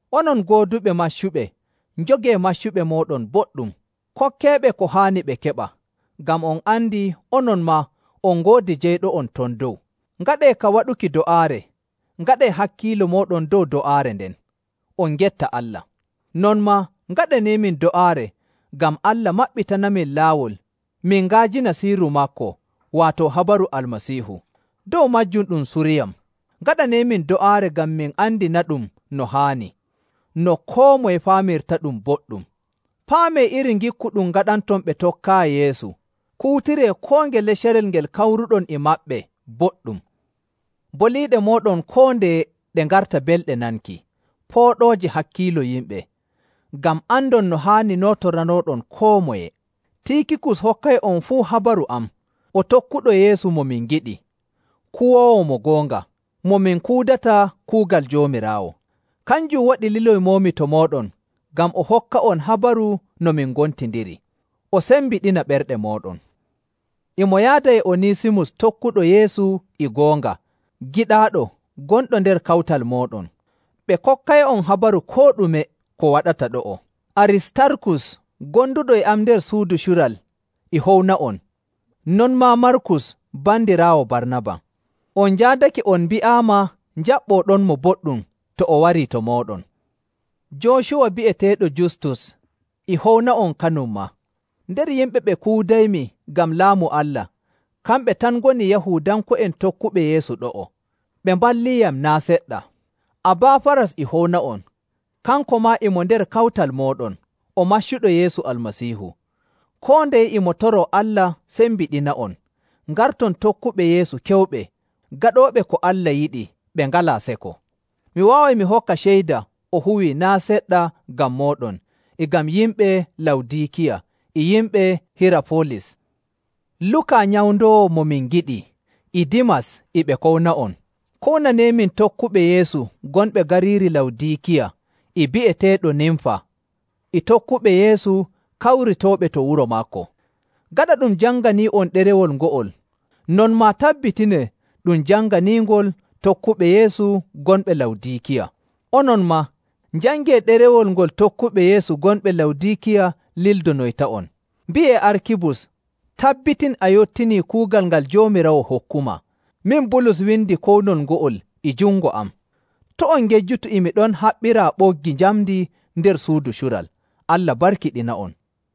Onon gooduɓe maccuɓe, njogee maccuɓe mooɗon boɗɗum, kokkeeɓe ko haani ɓe keɓa, ngam on andi onon maa on ngoodi jeyɗo'on ton dow. Ngaɗee ka waɗuki do'aare, ngaɗee hakkiilo mooɗon dow do'aare nden, on ngetta Allah. Non maa ngaɗaneemin do'aare ngam Allah maɓɓitanamin laawol min nga'ajina sirru maako, waato habaru Almasiihu. Dow maajum ɗum suriyam. Ngaɗaneeyam do'aare ngam mi andinaɗum no haani, no koo moye faamirtaɗum boɗɗum. Paamee iri ngikku ɗum ngaɗanton ɓe tokkaayi Yeesu; kuutiree koo ngele carel ngel kawruɗon e maɓɓe boɗɗum. Boliiɗe mooɗon koo ndeye ɗe ngarta belɗe nanki, pooɗooje hakkiilo yimɓe, ngam andon no haani nootoranooɗon koo moye. Tiikikus hokkay'on fuu habaru am. O tokkuɗo Yeesu mo min ngiɗi, kuwoowo mo goonga, mo min kuudata kuugal Joomiraawo. Kanjum waɗi liloymoomi to mooɗon, ngam o hokka'on habaru no min gontindiri, o sembiɗina ɓerɗe mooɗon. E mo yaada e Onisimus tokkuɗo Yeesu e goonga, giɗaaɗo, gonɗo nder kawtal mooɗon. Ɓe kokkay'on habaru koo ɗume ko waɗata ɗo'o. Aristarkus gonduɗo e am nder suudu cural e howna'on, non maa Markus bandiraawo Barnaba. (On njaadake on mbi'aama njaɓɓooɗonmo boɗɗum to o warii to mooɗon.) Joocuwa bi'eteeɗo Justus e howna'on kanum maa. Nder yimɓe ɓe kuudaymi ngam Laamu Allah, kamɓe tan ngoni Yahuudanko'en tokkuɓe Yeesu ɗo'o. Ɓe mballiiyam naa' seɗɗa. Abaafaras e howna'on, kanko maa e mo nder kawtal mooɗon, o maccuɗo Yeesu Almasiihu. Koo ndeye e mo toroo Allah sembiɗina'on, ngarton tokkuɓe Yeesu keewuɓe, gaɗooɓe ko Allah yiɗi ɓe ngalaa seko. Mi waaway mi hokka ceyda o huwii naa' seɗɗa ngam mooɗon e ngam yimɓe Lawdiikiya e yimɓe Hirafolis. Luka nyawndoowo mo min ngiɗi e Dimas e ɓe kowna'on. Kownaneemin tokkuɓe Yeesu gonɓe gariiri Lawdiikiya e bi'eteeɗo Nimfa e tokkuɓe Yeesu kawritooɓe to wuro maako. Gaɗa ɗum janganii'on ɗerewol ngo'ol, non maa tabbitinee ɗum janganiingol tokkuɓe Yeesu gonɓe Lawdiikiya. Onon maa, njangee ɗerewol ngol tokkuɓe Yeesu gonɓe Lawdiikiya lildonoyta'on. Mbi'ee Arkibus, “Tabbitin a yottinii kuugal ngal Joomiraawo hokkumaa.” Min Bulus windi kownol ngo'ol e jungo am. To' on ngejjutu e mi ɗon haɓɓiraa ɓoggi njamndi nder suudu cural. Allah barkiɗina'on.